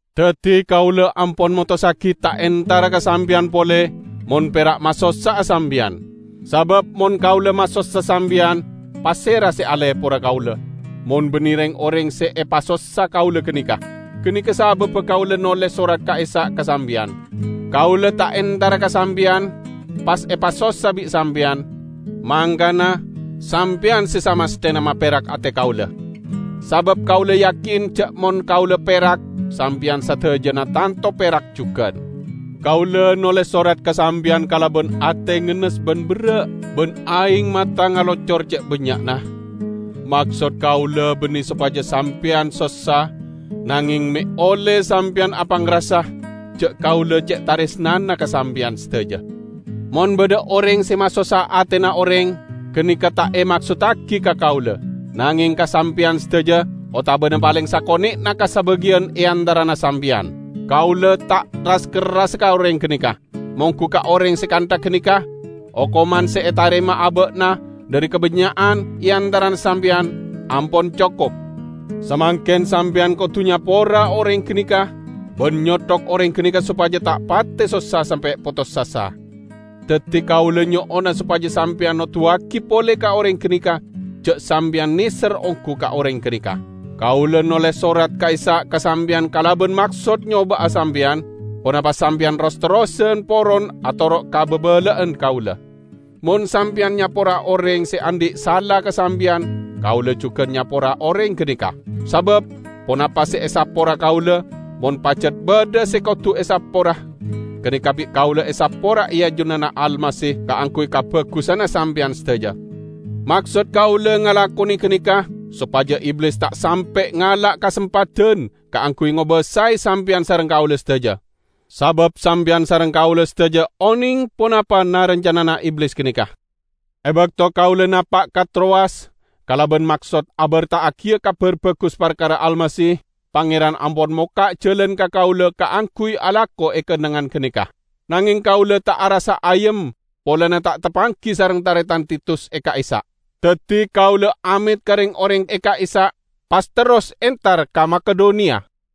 Daddi kaula ampon motossagi ta' entara ka sampeyan pole mon pera' masossa'a sampeyan. Sabab mon kaula masossa sampeyan, pasera se alepora kaula, mon banne reng-oreng se epasossa kaula ganeka? Ganeka sababba kaula noles sorat ka'issa' ka sampeyan. Kaula ta' entara ka sampeyan, pas epasossa bi' sampeyan, mangkana sampeyan se samasthena maperak ate kaula. Sabab kaula yakin ja' mon kaula perak, sampeyan sadajana tanto perak jugan. Kaula noles sorat ka sampeyan kalaban ate ngennes ban berra' ban aeng mata ngalocor ce' bannya'na. Maksod kaula banne sopaja sampeyan sossa, nangeng me' olle sampeyan apangrasa ja' kaula ce' taresnana ka sampeyan sadaja. Mon badha oreng se masossa atena oreng, ganeka ta' emaksottagi ka kaula, nangeng ka sampeyan sadaja otabana paleng sakone'na ka sabagiyan e antarana sampeyan. Kaula ta' ras-kerrasa ka oreng ganeka. Monggu ka oreng se kantha ganeka, okoman se etarema aba'na dhari kabannya'an e antarana sampeyan, ampon cokop. Samangken sampeyan kodu nyapora oreng ganeka ban nyothok oreng ganeka sopaja ta' pate sossa sampe' potos asa. Daddi kaula nyo'ona sopaja sampeyan noduwagi pole ka oreng ganeka ja' sampeyan neser onggu ka oreng ganeka. Kaula noles sorat ka'issa' ka sampeyan kalaban maksod nyoba'a sampeyan, ponapa sampeyan ros-terrosan poron atoro' ka babala'an kaula. Mon sampeyan nyapora oreng se andhi' sala ka sampeyan, kaula jugan nyapora oreng ganeka. Sabab ponapa se esapora kaula -- mon pajat badha se kodu esapora -- ganeka bi' kaula esapora e ajunanna Almasih kaangguy kabagusanna sampeyan sadaja. Maksod kaula ngalakone ganeka sopaja Iblis ta' sampe' ngala' kasempadan kaangguy ngobasae sampeyan sareng kaula sadaja: sabab sampeyan sareng kaula sadaja oneng ponapa na-rancanana Iblis ganeka. E bakto kaula napa' ka Trowas kalaban maksod aberta'agiya Kabar Bagus parkara Almasih, Pangeran ampon mokka' jalan ka kaula kaangguy alako e kennengngan ganeka. Nangeng kaula ta' arassa ayem polana ta' tapanggi sareng taretan Titus e ka'issa'. Daddi kaula amet ka reng-oreng e ka'issa', pas terros entar ka Makedoniya.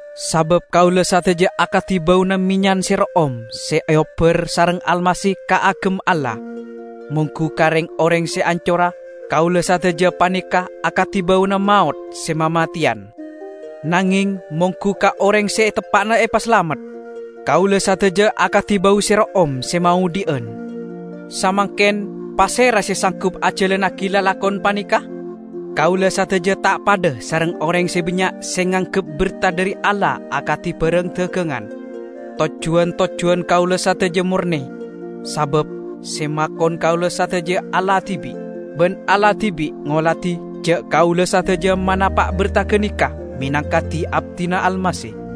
Sabab kaula sadaja akadi bauna mennyan se ro'om, se eobbar sareng Almasih kaagem Allah. Monggu ka reng-oreng se ancora, kaula sadaja paneka akadi bauna maot se mamateyan; nangeng monggu ka oreng se teppa'na epasalamet, kaula sadaja akadi bau se ro'om se maodhi'an. Samangken, pasera se sanggup ajalannagi lalakon paneka? Kaula sadaja ta' padha sareng oreng se bannya' se nganggep berta dhari Allah akadi barang dagangan. Tojjuwan-tojjuwan kaula sadaja morne, sabab se makon kaula sadaja Allah dibi'. Ban Allah dibi' ngoladi ja' kaula sadaja manapa' berta ganeka menangka di-abdina Almasih.